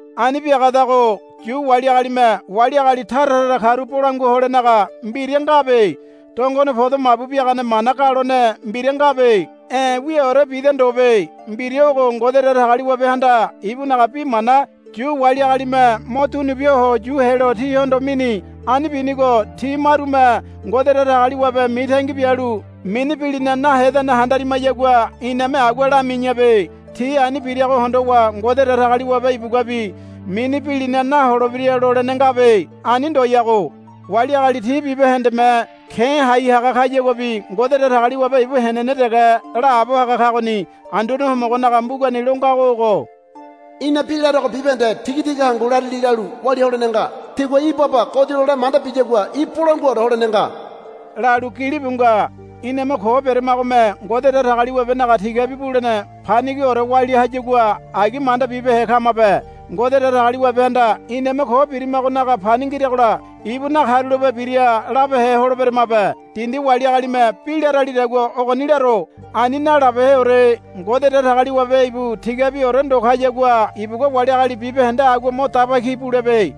Ani biagadago Yu wali agalime wali agali tara tara karu bolangua holenaga mbira ngabe. Dongone podo mabu biagane mana galone mbira ngabe. E̱ wiaore bida ndobe. Mbira ogo Ngode Datagaliwabehanda ibunaga bi mana Yu wali agalime mo dunubia ho yu helo tihondo mini. Ani binigo ti marume Ngode Datagaliwabe mitangi bialu mini bilina nahenedane handarimayagua iname agua lami̱yabe. Ti ani birago hondowa Ngode Datagaliwabe ibuguabi mini bilina naholebira lolene ngabe. Ani ndoyago. Wali agali ti bibahendeme ke̱ hai haga kayaguabi Ngode Datagaliwabe ibu henene dege laabo haga kagoni. Anduane Homogonaga mbugani lo ngago ogo, Í̠na bi larego bibahende tigatiga hangu larili lalu walia holene nga. Tigua í̠ baba godi lole manda biyagua í̠ bolanguaore holene nga, lalu gilibu nga. Iname ko beramagome Ngode Datagaliwabenaga tigabi bulene panigiore walia hayagua agi manda bibehe kamabe. Ngode Datagaliwabehanda iname ko birimagonaga pani ngiragola ibu nakarulape bira labehe holeberamabe. Dindi wali agalime bi laralidagua ogoni laro. Ani nalabeheore. Ngode Datagaliwabe ibu tigabiore ndo kayagua ibugua wali agali bibahende agua mo daba ki bulebe.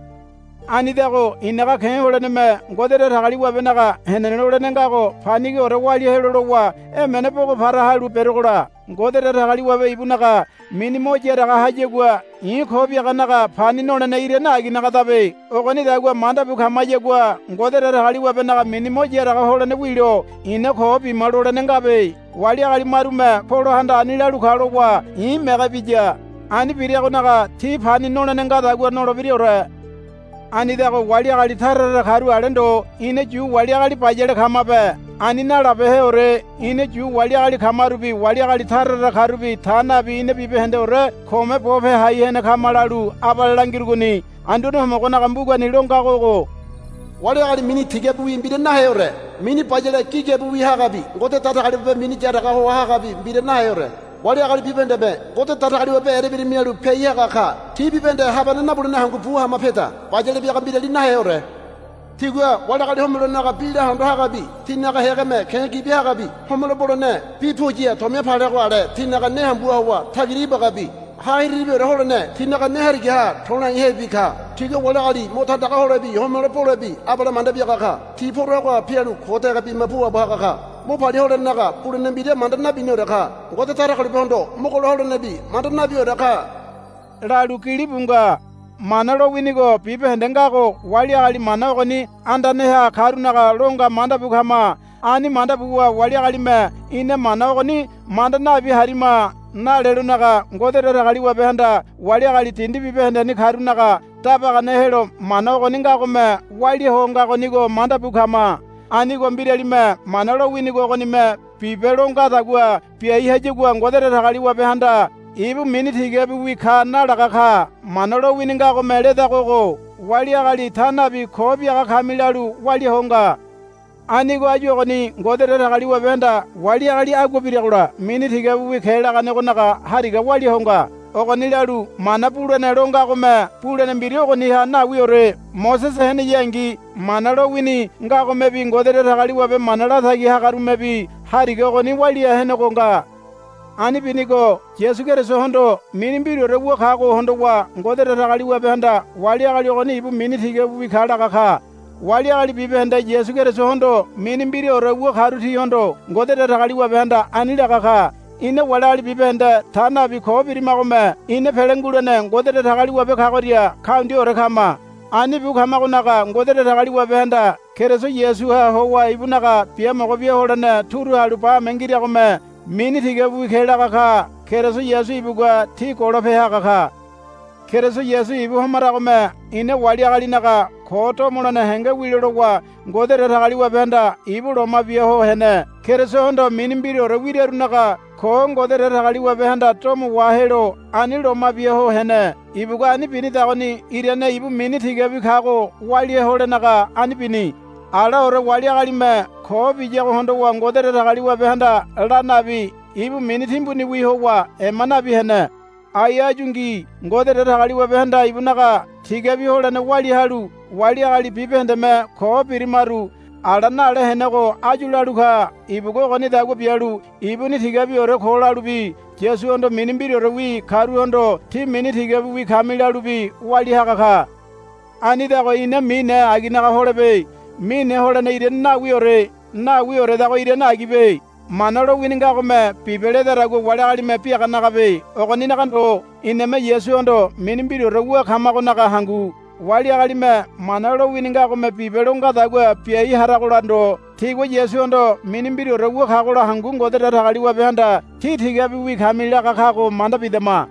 Anidago i̱naga ke̱ holeneme Ngode Datagaliwabenaga henene lolene ngago panigiore walia helo lowa emene bogo para halu berogola Ngode Datagaliwabe ibunaga mini mo yaraga hayagua i̱ ko biaganaga pani nolene irane aginagadabe. Ogonidagua manda bu kamayagua Ngode Datagaliwabenaga mini mo yaraga holene wilo ina ko bima lolene ngabe. Wali agali marume, Polohanda ani lalu ka, lowa i̱ mege biya. Ani biragonaga ti pani nolene ngadagua nolebiraore. Anidago wali agali tara tara karu ale ndo ina Yu wali agali bayale kamabe. Ani nalabeheore. Ina Yu wali agali kamarubi wali agali tara tara karubi ta nabi ina bibahendeore kome bope hai henego kama lalu abale langirugoni. Anduane Homogonaga mbugani lo ngago ogo, Wali agali mini tigabiwi mbira naheore. Mini bayale gigabiwi hagabi Ngode Datagaliwabe mini yaraga hoa hagabi mbira naheore. Wali agali bibahendeme Ngode Datagaliwabe erembira mialu piai haga ka. Ti bibahende habane nabulene hangu bu hama peda. Bayale biaga mbirali naheore. Tigua wali agali homelonaga bi lahondo hagabi tinaga hégeme ke̱ gibi hagabi homelo bolene bi puya tomia palego ale tinaga ne hambuha howa tagira ibagabi ha hiriribiore holene tinaga ne harigaha to̱laihebi ka. Tigua wali agali mo tandaga holebi homelo bolebi abale manda biaga ka. Ti poragoha pialu ko dege bima puabo haga ka. Mo palia holenaga bulene mbira manda nabiniore ka. Ngode Datagaliwabehondo mogolo holenebi manda nabiore ka, lalu gilibu nga. Mana lowinigo bibahende ngago wali agali mana ogoni andaneha karunaga lo nga manda bu kama. Ani manda buwa wali agalime, Ina Mana ogoni manda nabi harima, nalelonaga Ngode Datagaliwabehanda wali agali dindi bibahendeni karunaga dabagane helo Mana ogoni ngagome walia ho ngagonigo manda bu kama. Anigo mbiralime Mana lowinigo ogonime, Bibe, lo ngadagua biai hayagua Ngode Datagaliwabehanda ibu mini tigabiwi ka nalaga ka. Mana lowini ngagome ledago ogo, Wali agali ta nabi ko biaga kami, lalu walia ho nga. Anigo áyu ogoni Ngode Datagaliwabehanda wali agali agua biragola mini tigabiwi ke laganegonaga hariga walia ho nga. Ogoni lalu mana bulene lo ngagome bulene mbira ogoniha nawiore. Mosese heneyangi Mana lowini ngagomebi Ngode Datagaliwabe mana latagi hagarumebi hariga ogoni walia henego nga. Ani binigo Yasu Kerisohondo mini mbiraore wu kago hondowa Ngode Datagaliwabehanda wali agali ogoni ibu mini tigabiwi ka laga ka. Wali agali bibahende Yasu Kerisohondo mini mbiraore wu karu tihondo Ngode Datagaliwabehanda ani laga ka. Ina wali agali bibahende ta nabi ko birimagome ina pele ngulene Ngode Datagaliwabe kagoria kaundiaore kama. Ani bu kamagonaga Ngode Datagaliwabehanda Keriso Yasuha howa ibunaga biamogo bia holene turu halu bame ngiragome mini tigabiwi ke laga ka. Keriso Yasu ibugua ti golope haga ka. Keriso Yasu ibu homaragome ina wali agalinaga ko domolene henge wilo lowa Ngode Datagaliwabehanda ibu loma bia ho hene. Kerisohondo mini mbiraore wirarunaga ko Ngode Datagaliwabehanda domo wahelo ani loma bia ho hene. Ibugua ani binidagoni irane ibu mini tigabi kago walia holenaga ani bini. Alaore wali agalime ko biyago hondowa Ngode Datagaliwabehanda la nabi ibu mini timbuniwi howa ema nabi hene. Ai áyungi Ngode Datagaliwabehanda ibunaga tigabi holene walia halu wali agali bibahendeme ko birimaru ala nale henego áyu lalu ka. Ibugua ogonidagua bialu ibuni tigabiore ko lalubi Yasuhondo mini mbiraorewi karuhondo, Tí mini tigabiwi kami, lalubi walia haga ka. Anidago ina mine aginaga holebe. Mine holene irane nawiore. Nawioredago irane agibe. Mana lowini ngagome, Bibe, ledadagua wali agalime biaganagabe. Ogoninaga ndo. Iname Yasuhondo mini mbiraore wu kamagonaga hangu. Wali agalime Mana lowini ngagome, Bibe, lo ngadagua biai haragola ndo tigua Yasuhondo mini mbiraore wu kagola hangu Ngode Datagaliwabehanda, Tí tigabiwi kami, laga kago manda bidama.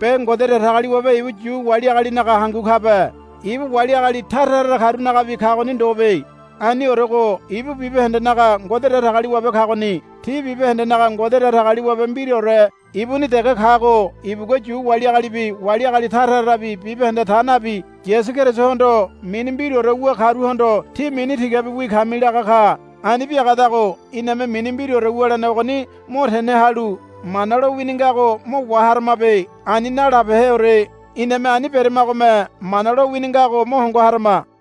Be Ngode Datagaliwabe ibu Yu wali agalinaga hangu kabe. Ibu wali agali tara tara karunagabi kagoni ndobe. Aniorego ibu bibahendenaga Ngode Datagaliwabe kagoni. Ti bibahendenaga Ngode Datagaliwabe mbiraore ibuni dege kago ibugua Yu wali agalibi wali agali tara tarabi bibahende ta nabi Yasu Kerisohondo mini mbiraore wu karuhondo, Tí mini tigabiwi kami, laga ka. Ani biagadago iname mini mbiraore wulene ogoni mo tene halu Mana lowini ngago mo waharamabe. Ani nalabeheore. Iname ani beramagome Mana lowini ngago mo hongo harama.